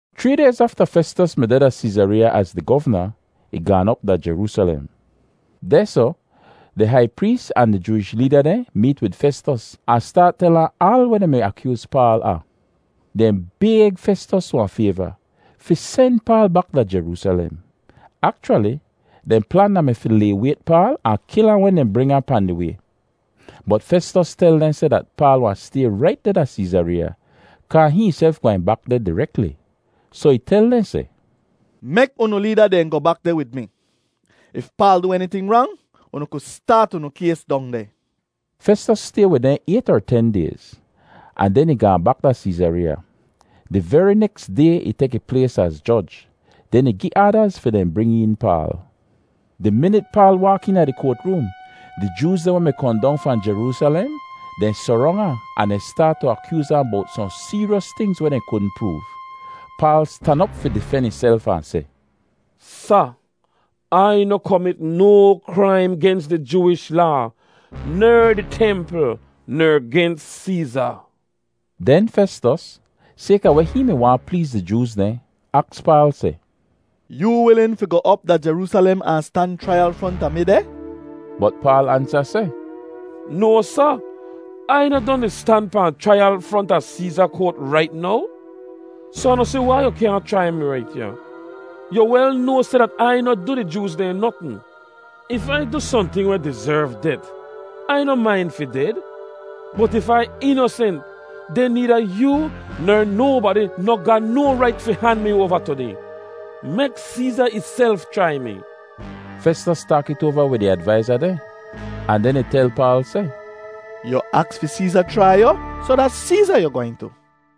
Chree dayz afta Festos mi deh da Seezareeya az di govna, ih gaan op da Jeroosalem. Dehsoh di hai prees ahn di Jooish leeda dehn meet wid Festos ahn staat tel ahn aal weh dehn mi akyooz Paal a. Dehn bayg Festos wahn fayva, fi sen Paal bak da Jeroosalem. Akchwali dehn plan da-mi fi laywayt Paal ahn kil ahn wen dehn bring ahn pahn di way. Bot Festos tel dehn seh dat Paal wahn stay rait deh da Seezareeya, kaa hihn ihself gwehn bak deh direkli. Soh ih tel dehn seh, “Mek unu leeda dehn goh bak deh wid mi. If Paal du eniting rang, unu ku staat unu kays dong deh.” Festos stay wid dehn ayt er ten dayz, ahn den ih gaahn bak da Seezareeya. Di veri neks day ih tek ih plays az joj, den ih gi aadaz fi dehn bring een Paal. Di minit Paal waak eena di koat room, di Jooz dehn weh mi kohn dong fahn Jeroosalem, dehn sorong ahn, ahn staat tu akyooz ahn bowt sohn seeryos tingz weh dehn kudn proov. Paal stan op fi difen ihself ahn seh, “Sa, Ai noh komit no kraim gens di Jooish Laa, ner di templ ner gens Seeza.” Den Festos, sayka weh hihn mi waahn pleez di Jooz dehn, aks Paal seh, “Yoo wilin fi goh op da Jeroosalem ahn stan chraiyal fronta mi deh?” Bot Paal ansa seh, “No, Sa! Ai noh don di stan pahn chraiyal fronta Seeza koat rait now? Soh Ah noh si wai yu kyaahn chrai mi rait ya. Yu wel noa seh dat Ai noh du di Jooz dehn notn. If Ai du sohnting weh dizerv det, Ai noh main fi ded. Bot if Ai inosent, den needa yoo ner nobadi noh ga no rait fi han mi oava tu dehn. Mek Seeza ihself chrai mi.” Festos taak it oava wid ih advaiza dehn ahn den ih tel Paal seh, “Yu aks fi Seeza chrai yu, soh da Seeza yu gwehn tu.”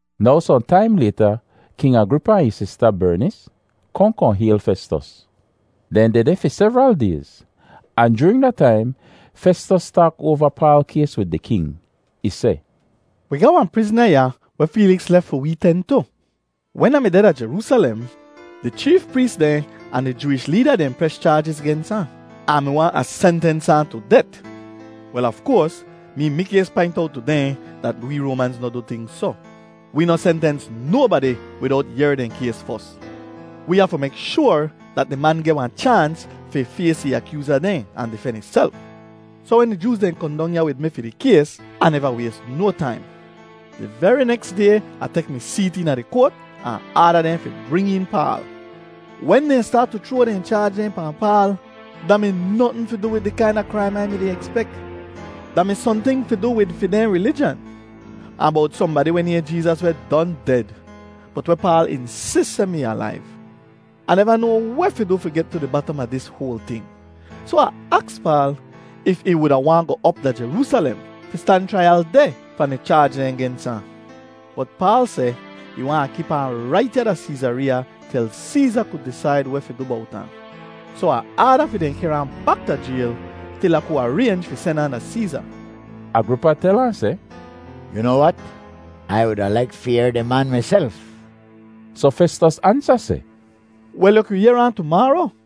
Now sohn taim layta King Agripa ahn ih sista, Bernis, kohn kohn hayl Festos. Dehn dehdeh fi sevral dayz, ahn joorin da taim Festos taak oava Paal kays wid di king. Ih seh, “Wi ga wahn prizna ya weh Feeliks lef fi wee ten tu. Wen Ah mi deh da Jeroosalem, di cheef prees dehn ahn di Jooish leeda dehn pres chaajiz gens ahn, ahn mi waahn Ah sentens ahn tu det. “Wel, af koars mee mikays paint owt tu dehn dat wee Roamanz noh du ting soh; wee noh sentens nobadi widowt yehr dehn kays fos. Wee hafu mek shoar dat di man geh wahn chaans fi fays ih akyooza dehn ahn difen ihself. Soh wen di Jooz dehn kohn dong ya wid mi fi di kays, Ah neva ways no taim; di veri neks day Ah tek mi seet eena di koat ahn aada dehn fi bring een Paal. Wen dehn staat tu chroa dehn chaaj dehn pahn Paal, da mi notn fi du wid di kaina kraim Ai mi-di ekspek. Da mi sohnting fi du wid fi dehn rilijan, ahn bowt sohnbadi weh nayhn Jeezas weh don ded, bot weh Paal insis seh mi alaiv. Ah neva noa weh fi du fi get tu di batam a dis hoal ting, soh Ah aks Paal if ih wuda waahn goh op da Jeroosalem fi stan chraiyal deh pahn di chaaj dehn gens ahn. Bot Paal seh ih waahn Ai kip ahn rait ya da Seezareeya til Seeza ku disaid weh fi du bowt ahn. Soh Ah aada fi dehn kehr ahn bak da jayl til Ah ku araynj fi sen ahn da Seeza.” Agripa tel ahn seh, “Yu noa wat, Ai wuda laik fi yehr di man miself.” Soh Festos ansa seh, “Wel, yu ku yehr ahn tumaaro.”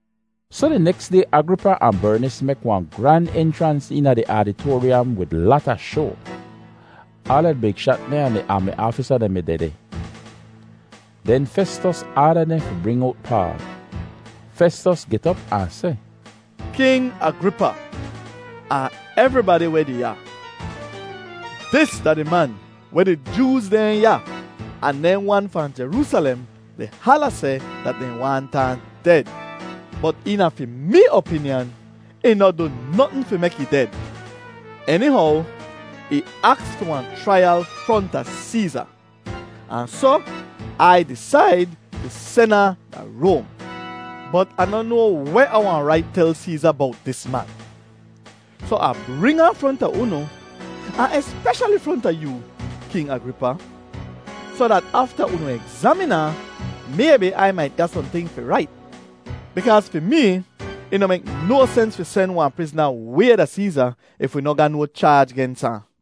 Soh di neks day Agripa ahn Bernis mek wahn gran enchrans eena di aditoaryam wid lata shoa. Aala di big shat dehn ahn di aami aafisa dehn mi dehdeh. Den Festos aada dehn fi bring owt Paal. Festos get op ahn seh, “King Agripa ahn evribadi weh deh ya, dis da di man weh di Jooz dehn ya ahn dehn wan fahn Jeroosalem di hala seh dat dehn waahnt ahn ded. Bot eena fi mee opinyan, ih noh du notn fi mek ih ded. Enihow ih aks fi wahn chraiyal fronta Seeza, ahn soh Ai disaid fi sen ahn da Roam. Bot Ah noh noa weh Ah wahn rait tel Seeza bowt dis man. Soh Ah bring ahn fronta unu, ahn espeshali fronta yoo, King Agripa, soh dat afta unu egzamin ahn, maybi Ai mait ga sohnting fi rait. Bikaaz fi mee ih noh mek no sens fi sen wahn prizna way da Seeza if wi noh ga no chaaj gens ahn.”